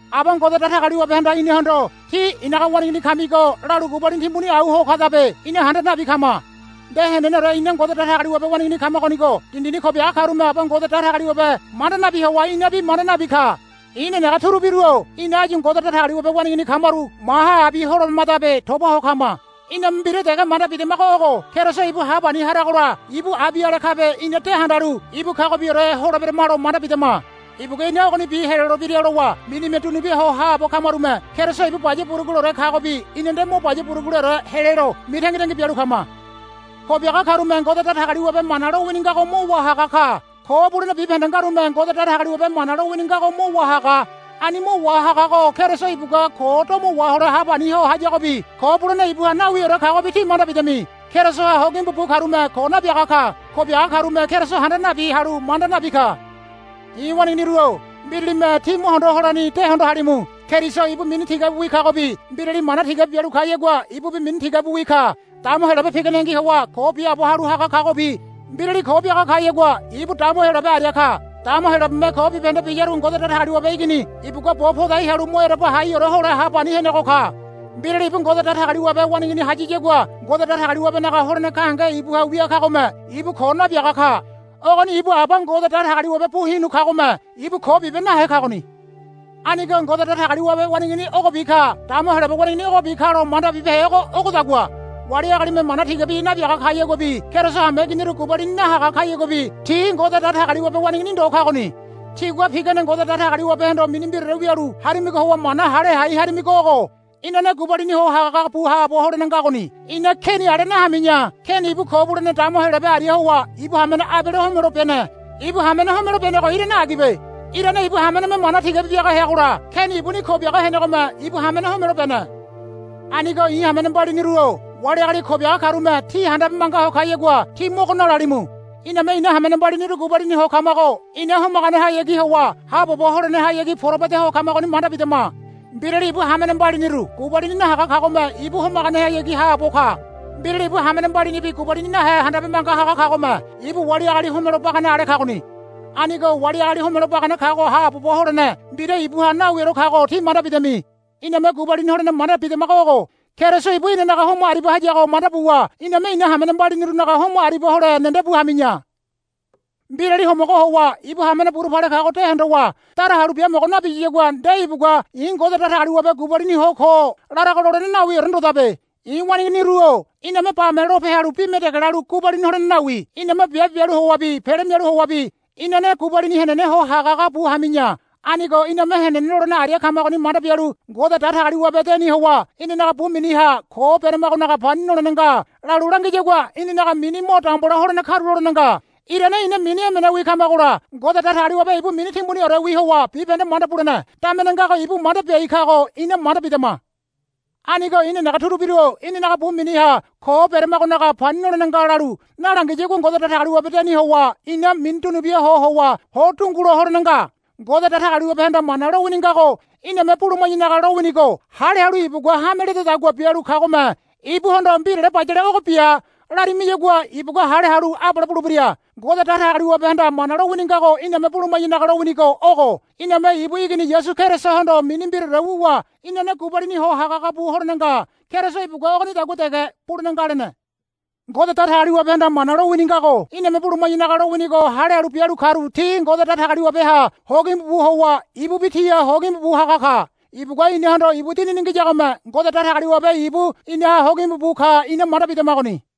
Aba Ngode Datagaliwabehanda inahondo, Tí i̱naga waneigini kamigo, lalu gubalini timbuni au ho kadabe ina handa nabi kama. Nde heneneore ina Ngode Datagaliwabe waneigini kamagonigo dindini ko biaga karume Aba Ngode Datagaliwabe manda nabi howa inabi manda nabi ka. I̱ nenege turubiru-o ina áyu Ngode Datagaliwabe waneigini kamaru maha abi holeberamadabe toba ho kama. Iname mbira dege manda bidamago ogo. Keriso ibu hapani haragola ibu abi ale kabe ina de handalu ibu kagobiore holeberamalo manda bidama. Ibugua ina ogonibi helolebira lowa minime dunubia ho haabo kamarume Keriso ibu baya buruguleore kagobi ina nde mo baya buruguleore helelo mitangitangi bialu kama. Ko biaga karume Ngode Datagaliwabe mana lowini ngago mo wahaga ka. Ko bulene bibahende ngarume Ngode Datagaliwabe mana lowini ngago mo wahaga. Ani mo wahagago Keriso ibugua ko domo wahole hapani ho hayagobi ko bulene ibuha nawiore kagobi tí manda bidami. Kerisoha hogimbu bu karume ko nabiaga ka. Ko biaga karume Keriso handa nabi halu manda nabi ka. I̱ waneiginiru-o mbiralime tí mo hondo holani de hondo halimu. Keriso ibu mini tigabiwi kagobi mbirali mana tigabi bialu kayagua ibubi mini tigabiwi ka. Dama Heyolabe piganengi howa ko biaabo halu haga kagobi mbirali ko biaga kayagua ibu dama Heyolabe aria ka. Dama Heyolabeme ko bibahende biyaru Ngode Datagaliwabe Igini ibugua bo podai halu mo ereba haiore hole hapani ho henego ka. Mbirali ibu Ngode Datagaliwabe waneigini hayayagua Ngode Datagaliwabenaga holene gahenge ibuha wia kagome ibu ko nabiaga ka. Ogoni ibu Aba Ngode Datagaliwabe bu hinu kagome ibu ko bibe nahe kagoni. Anigo Ngode Datagaliwabe waneigini ogobi ka dama Heyolabe waneigini ogobi kalo manda bibehego ogodagua. Wali agalime mana tigabi nabiaga kayaguabi Keriso hameiginiru gubalini nahaga kayaguabi ti Ngode Datagaliwabe waneigini ndo kagoni. Tígua pigane Ngode Datagaliwabehondo mini mbiraore wialu harimigo howa mana hale hai harimigo ogo. Inane gubalini ho hagahaga bu haabo holene ngagoni. Ina Keni ale nahami̱ya. Keni ibu Ko Bulene Dama Heyolabe aria howa ibu hamene Abele homelo bene. Ibu hamene homelo benego irane agibe. Irane ibu hameneme mana tigabi biaga heagola Keni ibuni ko biaga henegome ibu hamene homelo bene. Anigo i̱ hamene mbaliniru-o wali agali ko biaga karume tí handabe manga ho kayagua tí mogo nalalimu. Iname ina hamene mbaliniru gubalini ho kamago ina homaganehayagi howa haabobo holenehayagi porabu ede ho kamagoni manda bidama. Mbirali ibu hamene mbaliniru gubalini nahaga kagome ibu homaganehayagi haabo ka. Mbirali ibu hamene mbalinibi gubalini nahe handabe manga haga kagome ibu wali agali homelo bagane ale kagoni. Anigo wali agali homelo bagane kago haabobo holene mbira ibuha nawiore kago tí manda bidami. Iname gubalini holene manda bidamago ogo. Keriso ibu inanaga homo aribia hayago manda buwa iname ina hamene mbalinirunaga homo aribia hole nendebu hami̱ya. Mbirali homogo howa ibu hamene burupale kago de hondowa dara halu biamogo nabiyagua nde ibugua, I̱ Ngode Datagaliwabe gubalini ho ko, larago lolene nawiore ndodabe. I̱ waneiginiru-o iname bame lope halu bime dege lalu gubalini holene nawi. Iname biabe bialu howabi pele mialu howabi inane gubalini henene ho hagahaga bu hami̱ya. Anigo iname henene lolene aria kamagoni manda bialu Ngode Datagaliwabe deni howa inanaga bu miniha, Ko beramagonaga pani nolene nga, lalu langiyagua inanaga mini mo dambola holene karulolene nga. Irane ina mini emenewi kamagola Ngode Datagaliwabe ibu mini timbuniorewi howa bibahende manda bulene damene ngago ibu manda biai kago ina manda bidama. Anigo i̱ nenege turubiru-o inanaga bu miniha, Ko beramagonaga pani nolene nga, lalu nalangiyagua Ngode Datagaliwabe deni howa ina mini dunubia ho howa ho dungulo holene nga. Ngode Datagaliwabehanda mana lowini ngago iname buluma̱yanaga lowinigo hale halu ibugua hame ledadagua bialu kamagome ibuhondo, Mbirale bayale ogo bia, lamirimayagua ibugua hale halu abale bulebira. Ngode Datagaliwabehanda mana lowini ngago iname buluma̱yanaga lowinigo ogo. Iname ibu Igini Yasu Kerisohondo mini mbiraore wuwa inane gubalini ho hagahaga bu holene nga. Keriso ibugua ogonidagua dege bulene nga lene. Ngode Datagaliwabehanda mana lowini ngago iname buluma̱yanaga lowinigo hale halu bialu karu ti Ngode Datagaliwabeha hogimbu bu howa ibubi tiha hogimbu bu haga ka. Ibugua inahondo ibu Dinini ngiyagome Ngode Datagaliwabe ibu inaha hogimbu bu ka ina manda bidamagoni.